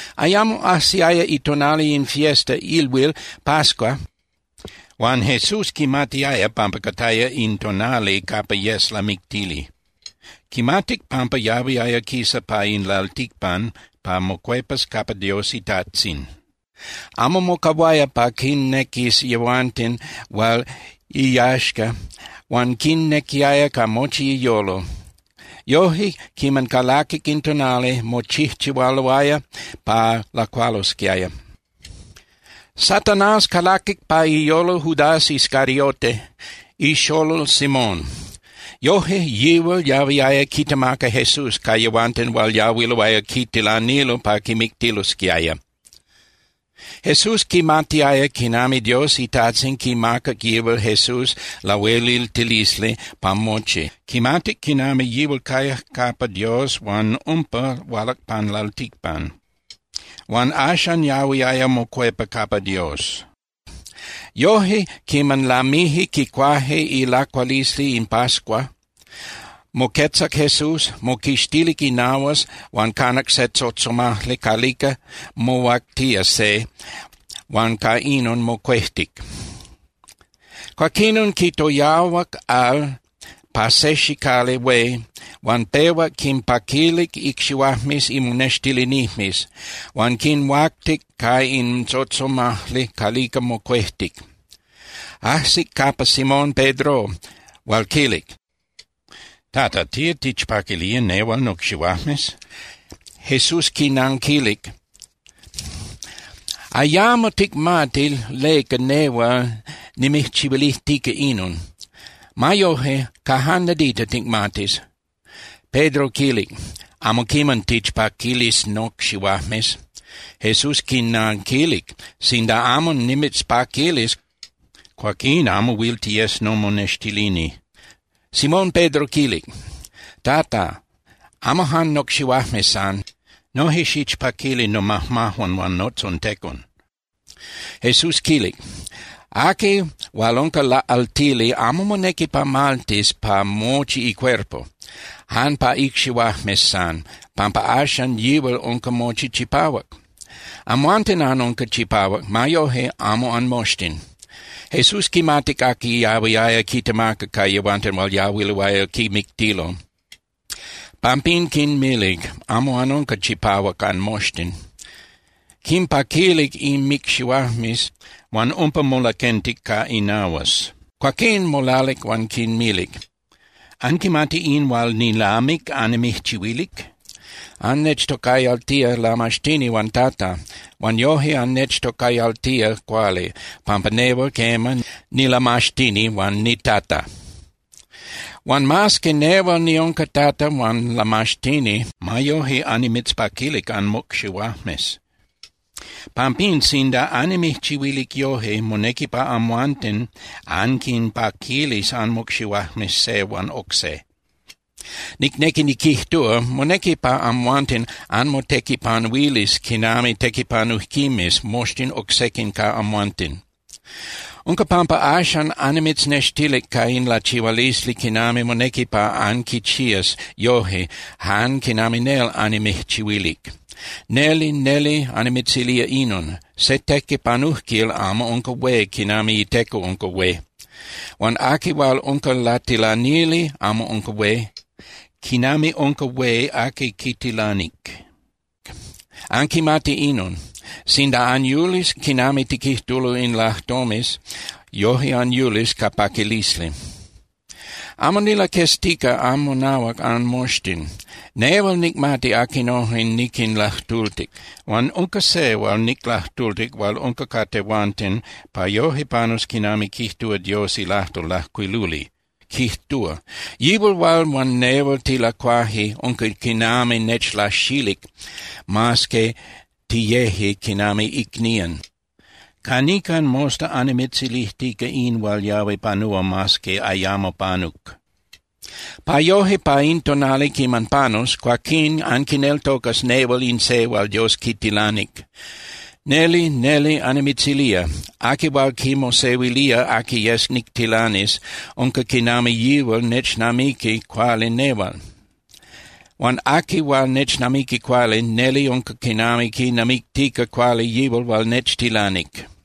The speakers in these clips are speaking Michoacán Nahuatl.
Ayamo ajsiaya itonali in fiesta (ilhuil) pascua huan Jesús quimatiaya pampa cataya in tonali capa yes lamictili. Quimatic pampa yahuiaya quisa pa in lalticpan pa mocuepas capa Dios iTajtzin. Amo mocahuaya pa quinnequis yehuanten hual iyaxca huan quinnequiaya ca mochi iyolo. Yoje, quiman calaquic in tonali, mochijchihualoaya pa lacualosquiaya. Satanás calaquic pa iyolo Judas Iscariote, ixolol Simón. Yoje yihual yahuiaya quitemaca Jesús ca yehuanten hual yahuiloaya quitilanilo pa quimictilosquiaya. Jesús quimatiaya quinami Dios iTajtzin quimacac yihual Jesús lahueliltilisli pa mochi. Quimatic quinami yihual cayac capa Dios huan umpa hualac pan lalticpan. Huan axan yahuiaya mocuepa capa Dios. Yoje, quiman lamije quicuaje ilacualisli in pascua, moquetzac Jesús, moquixtilic inahuas huan canac se tzotzomajli calica mohuactía se, huan ca inon mocuejtic. Cuaquinon quitoyahuac al pa se xicali hué huan pehuac quinpaquilic icxihuajmes imonextilinijmes huan quinhuactic ca in tzotzomajli calica mocuejtic. Ajsic capa Simón Pedro, hual quilic: —Tata, ¿tía tichpaquilía nehual nocxihuajmes? Jesús quinanquilic: —Ayamo ticmati leca nehual nimijchihuilijtica inon. Ma yoje, ca jan nadita ticmatis. Pedro quilic: —Amo quiman tichpaquilis nocxihuajmes. Jesús quinanquilic: —Sinda amo nimitzpaquilis, cuaquín amo huil tiyes nomonextilini. Simón Pedro quilic: —Tata, amo jan nocxihuajmes san. Noje xichpaquili nomajmajuan huan notzontecon. Jesús quilic: —Aqui hual unca laꞌaltili amo monequi pa maltis pa mochi icuerpo, jan pa icxihuajmes san, pampa axan yihual unca mochi chipahuac. Amhuanten anunca chipahuac, ma yoje amo anmoxtin. Jesús quimatic aqui yahuiaya quitemaca ca yehuanten hual yahuiloaya quimictilo. Pampín quinmilic: “Amo anunca chipahuac anmoxtin.” Quimpaquilic inmicxihuajmes huan umpa molaquentic ca inahuas. Cuaquín molalic huan quinmilic: —¿Anquimati in hual nilamic annimijchihuilic? Annechtocayaltía Lamaxtini huan Tata. Huan yoje annechtocayaltía cuali, pampa nehual, quema, nilamaxtini huan niTata. Huan mas que nehual niunca Tata huan Lamaxtini, ma yoje annimitzpaquilic anmocxihuajmes. Pampín, sinda annimijchihuilic yoje, monequi pa amhuanten anquinpaquilis anmocxihuajmes se huan oc se. Nicnequi niquijtúa, monequi pa amhuanten anmotequipanuilis quinami tequipanujquimes moxtin oc sequin ca amhuanten. Unca pampa axan annimitznextilic ca in lachihualisli quinami monequi pa anquichías yoje jan quinami nel annimijchihuilic. Neli, neli annimitzilía inon: Se tequipanujquil amo unca hué quinami iteco unca hué. Huan aqui hual unca latilanili amo unca hué quinami unca hué aqui quitilanic. Anquimati inon. Sinda anyulis quinami quijtulo in lajtomes, yoje anyulis ca paquilisli. ’Amo nilaqueztica anmonahuac anmoxtin. Nehual nicmati aquinojen niquinlajtultic. Huan unca se hual niclajtultic hual unca ca tehuanten pa yoje panus quinami quijtúa Dios ilajtol lajcuiluli, quijtúa: “Yihual hual huan nehual tilacuaje, unca quinami nechlaxilic mas que tiyeje quinami icnían.” Ca nican mosta annimitzilijtica in hual yahui panúa mas que ayamo panuc, pa yoje pa in tonali quiman panus, cuaquín anquineltocas nehual in se hual Dios quitilanic. Neli, neli annimitzilía, aqui hual quimosehuilía aqui yes nictilanis, unca quinami yihual nechnamiqui cuali nehual. Huan aqui hual nechnamiqui cuali, neli unca quinami quinamictica cuali yihual hual nechtilanic.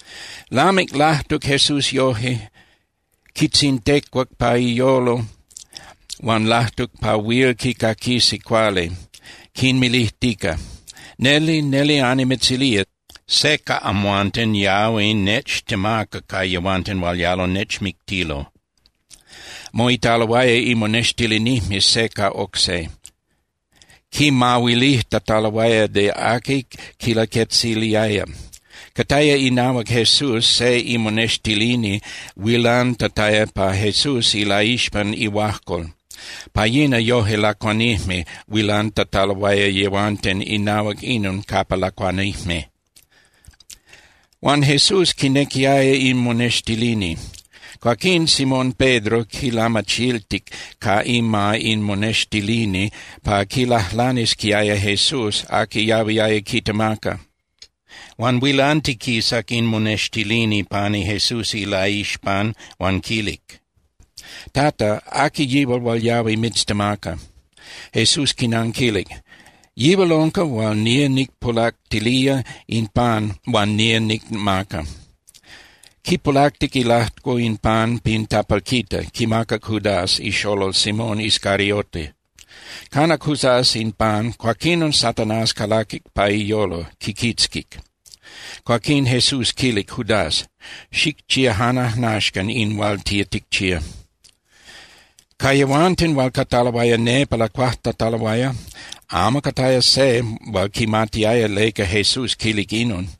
Lamic lajtuc Jesús yoje, quitzintecuac pa iyolo huan lajtuc pa huil quicaquisi cuali, quinmilijtica: —Neli, neli annimitzilía, se ca amhuanten yahui nechtemaca ca yehuanten hual yalo nechmictilo. Moitaloaya imonextilinijmes se ca oc se, quimahuilijtataloaya de aqui quilaquetziliaya. Cataya inahuac Jesús se imonextilini huilantataya pa Jesús ilaixpan ihuajcol. (Pa yina yoje lacuanijme huilantataloaya yehuanten inahuac inon capa lacuanijme.) Huan Jesús quinequiaya in monextilini. Cuaquín Simón Pedro quilamachiltic ca ima in monextilini pa quilajlanisquiaya Jesús aqui yahuiaya quitemaca. Huan huilantiquisac in monextilini pani Jesús ilaixpan huan quilic: —Tata, ¿aqui yihual hual yahui mitztemaca? Jesús quinanquilic: —Yihual unca hual nía nicpulactilía in pan huan nía nicmaca. Quipulactic ilajco in pan pin tapalquita, quimacac Judas ixolol Simón Iscariote. Canac Judas in pan, cuaquinon Satanás calaquic pa iyolo, quiquitzquic. Cuaquín Jesús quilic Judas: —Xicchía jan ajnaxcan in hual tía ticchía. Ca yehuanten hual cataloaya nepa lacuajtataloaya, amo cataya se hual quimatiaya leca Jesús quilic inon.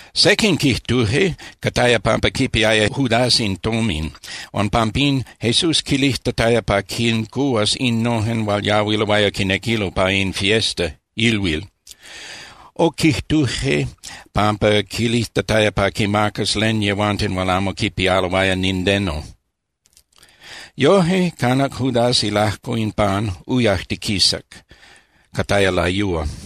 Sequin quijtuje cataya pampa quipiaya Judas in tomin, huan pampín Jesús quilijtataya pa quincuhuas innojen hual yahuiloaya quinequilo pa in fiesta (ilhuil). O quijtuje pampa quilijtataya pa quimacas len yehuanten hual amo quipialoaya nindeno. Yoje, canac Judas ilajco in pan, uyajtiquisac. Cataya layúa.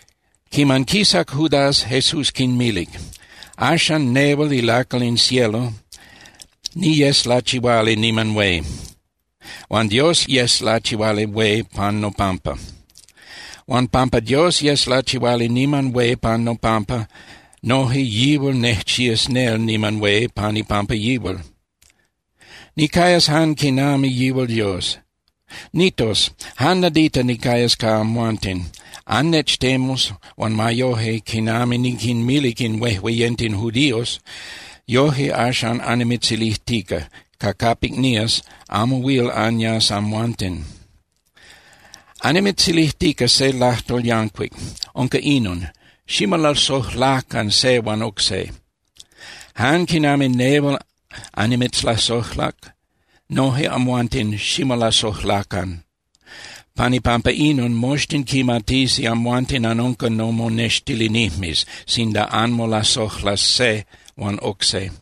Quiman quisac Judas, Jesús quinmilic: —Axan, nehual ilacal in cielo niyes lachihuali niman hué. Huan Dios yes lachihuali hué pan nopampa. Huan pampa Dios yes lachihuali niman hué pan nopampa, noje yihual nejchías nel niman hué pan ipampa yihual. Nicayas jan quinami yihual Dios. Nitos, jan nadita nicayas ca amhuanten. Annechtemus, huan ma yoje, quinami niquinmilic in huejueyenten judíos, yoje axan annimitzilijtica, ca capic nías, amo huil anyas amhuanten. Annimitzilijtica se lajtol yancuic, unca inon: Ximolasojlacan se huan oc se. Jan quinami nehual annimitzlasojlac, noje amhuanten ximolasojlacan. Pan ipampa inon, moxtin quimatisi amhuanten anunca nomonextilinijmes, sinda anmolasojlas se huan oc se.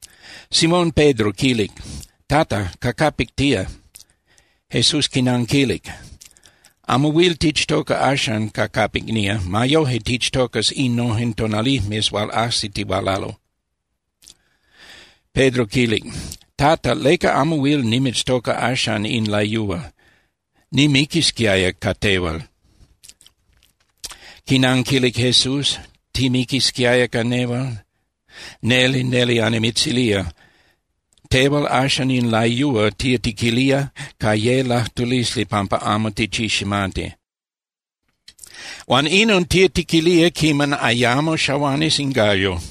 Simón Pedro quilic: —Tata, ¿ca capic tía? Jesús quinanquilic: —Amo huil tichtoca axan ca capic nía. Ma yoje, tichtocas innojen tonalijmes hual ajsitihualalo. Pedro quilic: —Tata, ¿leca amo huil nimitztoca axan in layúa? Nimiquisquiaya ca tehual. Quinanquilic Jesús: —¿Timiquisquiaya ca nehual? Neli, neli annimitzilía, tehual axan in layúa tía tiquilía ca ye lajtulisli pampa amo tichiximati, huan inon tía tiquilía quiman ayamo xahuanis in gallo.